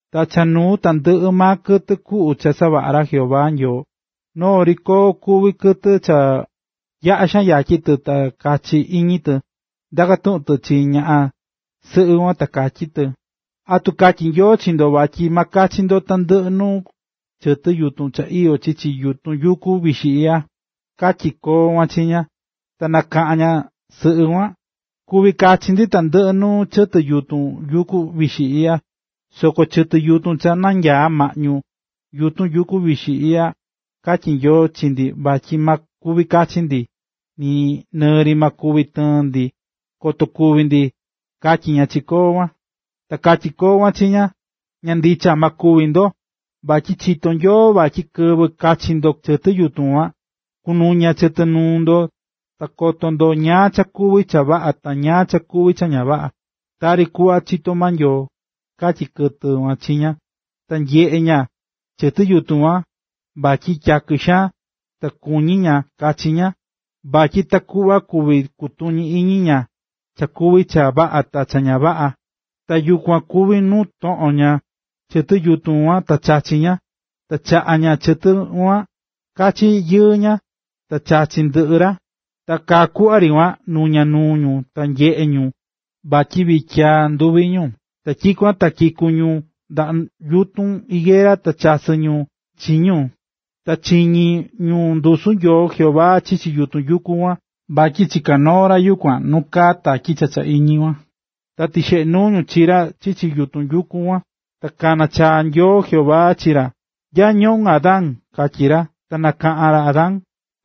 Ta cha nuu tandɨꞌɨ maa kɨtɨ kuꞌu cha savaꞌa̱ ra Jehová Nyoo, noo ri koo kuví kɨtɨ cha yaꞌa xaan yatyi tɨ ta kachi iñi tɨ, ta ndaka̱ tuꞌun tɨ chi ñaꞌan sɨꞌɨ kuan, ta katyí tɨ: ―¿Atu katyí Nyoo chi ndo, vatyi ma kuvi kachi ndo tandɨꞌɨ nuu chɨtɨ yutun cha iyó chichi yutun yuku vixi iꞌya? ―katyí koo kuan chi ña. Ta nakaꞌa̱n ñaꞌan sɨꞌɨ kuan: ―Kuví kachi ndi tandɨꞌɨ nuu chɨtɨ yutun yuku vixi iꞌya, soko chɨtɨ yutun cha nanyaá maꞌñu yutun yuku vixi iꞌya, katyí Nyoo chi ndi vatyi ma kuvi kachi ndi nɨɨ ri ma kuvi tɨɨn ndi, koto kúvi ndi ―katyí ña chi koo kuan. Ta katyí koo kuan chi ña: ―Ña ndicha, ma kúvi ndo. Vatyi chitó Nyoo vatyi kɨvɨ kachi ndo chɨtɨ yutun kuan, kunuña chɨtɨ nuu ndo ta koto ndo ñáá cha kuví cha vaꞌa ta ñáá cha kuví cha ña vaꞌa, tari kuꞌva chitó maa Nyoo ―katyi tɨ chi ña. Ta nyeꞌe̱ ña chɨtɨ yutun kuan vatyi tyakɨ xaan, ta kuñí ña kachi ña, vatyi takuꞌva kuvi kutuñi iñi ña ñáá cha kuví cha vaꞌa ta ñáá cha kuví cha ña vaꞌa. Ta yukuan kuvi̱ nu toꞌo̱n ña chɨtɨ kuan ta chachi̱ ña. Ta chaꞌa̱ ña chɨtɨ kuan kachi yɨɨ ña, ta chachi̱ ndɨꞌɨ ra. Ta kaa kuꞌva ri kuan, ta nuña̱ nuu ñu, ta nanyeꞌe̱ ñu vatyi vityiyaa nɨnduvi ñu. Ta tyikuan ta kiku̱ ñu ndaꞌa yutun higuera, ta chasɨ̱ ñu chi ñu. Ta chiñi̱ ñu ndusu Nyoo Jehová chichi yutun yuku kuan, vatyi chiká noo ra yukuan nu kaá tatyi cha cha iñi kuan. Ta tixeꞌe̱ nuu ñu chi ra chichi yutun kuan. Ta kana̱ chaa Nyoo Jehová chi ra: ―¿Nya ñoꞌún, Adán? ―katyí ra. Ta nakaꞌa̱n ra Adán: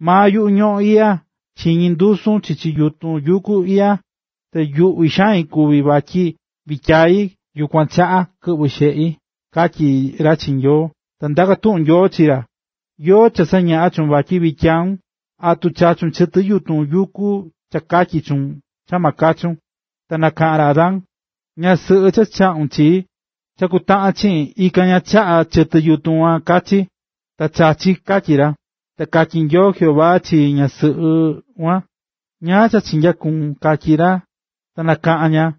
―Maa yuꞌu ñoꞌón iꞌya, chiñi̱ ndusun chichi yutun yuku iꞌya, ta yuꞌví xain kuvi̱ vatyi vityiyai, yukuan chaꞌa kɨꞌvɨ̱ xeꞌi ―katyí ra chi Nyoo. Ta ndaka̱ tuꞌun Nyoo chi ra: ―¿Yóó cha sañaꞌa̱ chuun vatyi vityiyaun? ¿Atu chachu̱n chɨtɨ yutun cha katyi̱ chuun, cha ma kachun? Ta nakaꞌa̱n ra Adán: ―Ñaꞌan sɨꞌɨ cha chaꞌu̱n chii, cha kutaꞌan chiꞌin, ikan ña chaꞌa̱ chɨtɨ kuan kachi, ta chachi̱ ―katyí ra. Ta katyí Nyoo Jehová chi ñaꞌan sɨꞌɨ kuan: ―¿Ñáá cha chinyakuvu̱n? ―katyí ra. Ta nakaꞌa̱n ña: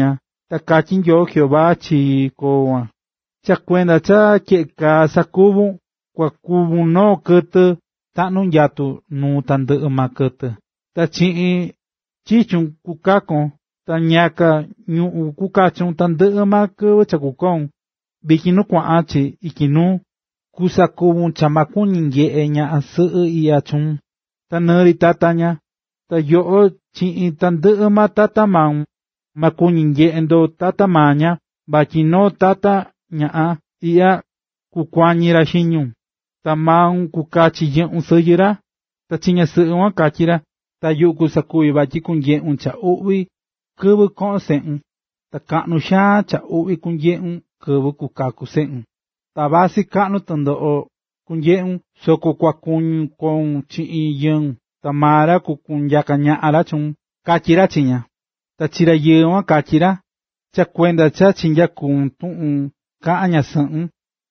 Ta katyí Nyoo Jehová chi koo kuan: ―Cha kuenda cha tyeꞌe kaa sakuvu̱n, kua kuvun noo kɨtɨ taꞌnu̱ nyatu nuu tandɨꞌɨ maa kɨtɨ, ta chiꞌin chichun kukakon, ta ñiyaka ñuꞌún kukachun tandɨꞌɨ maa kɨvɨ cha kukoun, vityin ta nu kuaꞌan chi ityi nuu. Kusakuvi cha ma kuñi nyeꞌe ñaꞌan sɨꞌɨ iꞌya chuun, ta nɨɨ ri tata ña. Ta yoꞌo chiꞌin tandɨꞌɨ tata maun, ma kuñi nyeꞌe ndo tata maa ña, vatyi noo tata ñaꞌan iꞌya, kukuañi ra xiñun, ta maun kukachi yɨꞌun sɨyɨ ra. Ta chi ñaꞌan sɨꞌɨ kuan katyí ra: ―Ta yuꞌu kusakuvi vatyi kunyeꞌun cha uꞌvi kɨvɨ koꞌon seꞌun, ta kaꞌnu xaan cha uꞌvi kunyeꞌun kɨvɨ kukaku seꞌun. Ta vasɨ kaꞌnu tɨndoꞌo kunyeꞌun soko kua kuñun koun chiꞌin yɨun, ta maa ra kukunyaka ñaꞌan ra chuun ―katyí ra chi ña. Ta chi rayɨɨ kuan katyí ra: ―Ta cha kuenda cha kichaꞌu̱n tuꞌun kaꞌa̱n ñasɨꞌun,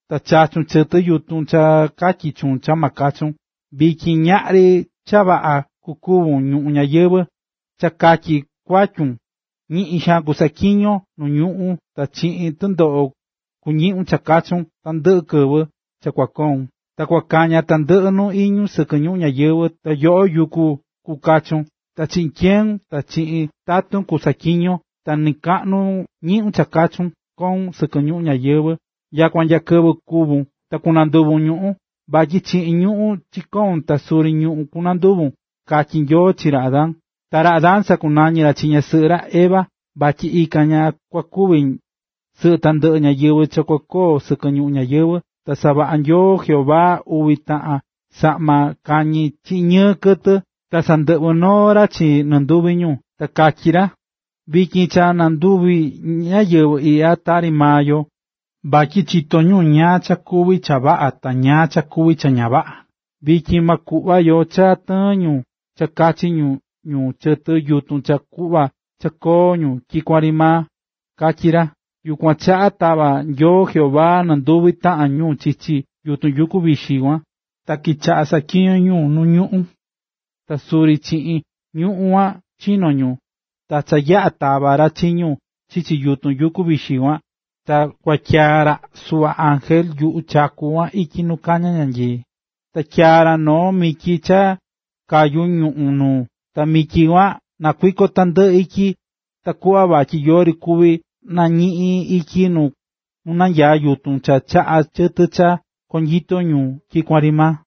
ta chachu̱n chɨtɨ yutun cha katyi̱ chuun cha ma kachun, vityin ñaꞌri cha vaꞌa kukuvi ñuꞌún ñayɨvɨ̱, cha katyi kuatyun, ñiꞌin xaan kusaꞌatyiñon nu ñuꞌún, ta chiꞌin tɨndoꞌo kuñiꞌun cha kachun tandɨꞌɨ kɨvɨ cha kua koun. Ta kua kaña tandɨꞌɨ nuu iñu sɨkɨ ñuꞌún ñayɨvɨ̱, ta yoꞌo yuku kukachun. Ta chiꞌin tyeun, ta chiꞌin tatun kusaꞌatyiñon ta ñiꞌun kachun koun sɨkɨ ñuꞌún ñayɨvɨ̱ nyakua nya kɨvɨ kúvun ta kunanduvun ñuꞌún, vatyi chiꞌin ñuꞌún chino̱n ta suri ñuꞌún kunanduvun ―katyí Nyoo chi ra Adán. Ta ra Adán sakunañi̱ ra chi ñasɨꞌɨ ra, Eva, vatyi ikan ña kua kuvi sɨꞌɨ tandɨꞌɨ ñáyɨvɨ cha kukoo sɨkɨ ñuꞌún ñayɨvɨ̱. Ta savaꞌa̱ Nyoo Jehová uvi taꞌan saꞌma kañi chiꞌin ñɨɨ kɨtɨ, ta sandɨꞌvɨ̱ noo ra chi nɨnduvi ñu. Ta katyí ra: “Vityin cha nanduvi̱ ñáyɨvɨ iꞌya tari maa yo, vatyi chitó ñu ñáá cha kuví cha vaꞌa ta ñáá cha kuvi cha ña vaꞌa. Vityin ma kuꞌva yo cha tɨɨn ñu ta kachi ñu chɨtɨ yutun cha kuꞌva cha koo ñu tyikuan ri maa”, katyí ra. Yukuan chaꞌa tava̱ Nyoo Jehová nɨnduvi taꞌan ñu chichi yutun yuku vixi kuan. Ta kichaꞌa̱ saꞌatyiñó ñu nuu ñuꞌún, ta suri chiꞌin ñuꞌún kuan chino̱ ñu. Ta cha yaꞌa̱ tava̱ ra chi ñu chichi yutun yuku vixi kuan, ta kuatyaa̱ ra suꞌva ángel yuꞌu chaku kuan ityi nu kaña ñanyii, ta tyaa̱ ra noo mityi cha kayú ñuꞌu̱n nuu, ta mityi kuan nakuikó tandɨꞌɨ ityi takuꞌva vatyi yori kuvi nañiꞌin ityi nu nanyaá yutun cha chaꞌá chɨtɨ cha konyito ñu tyikuan ri maa.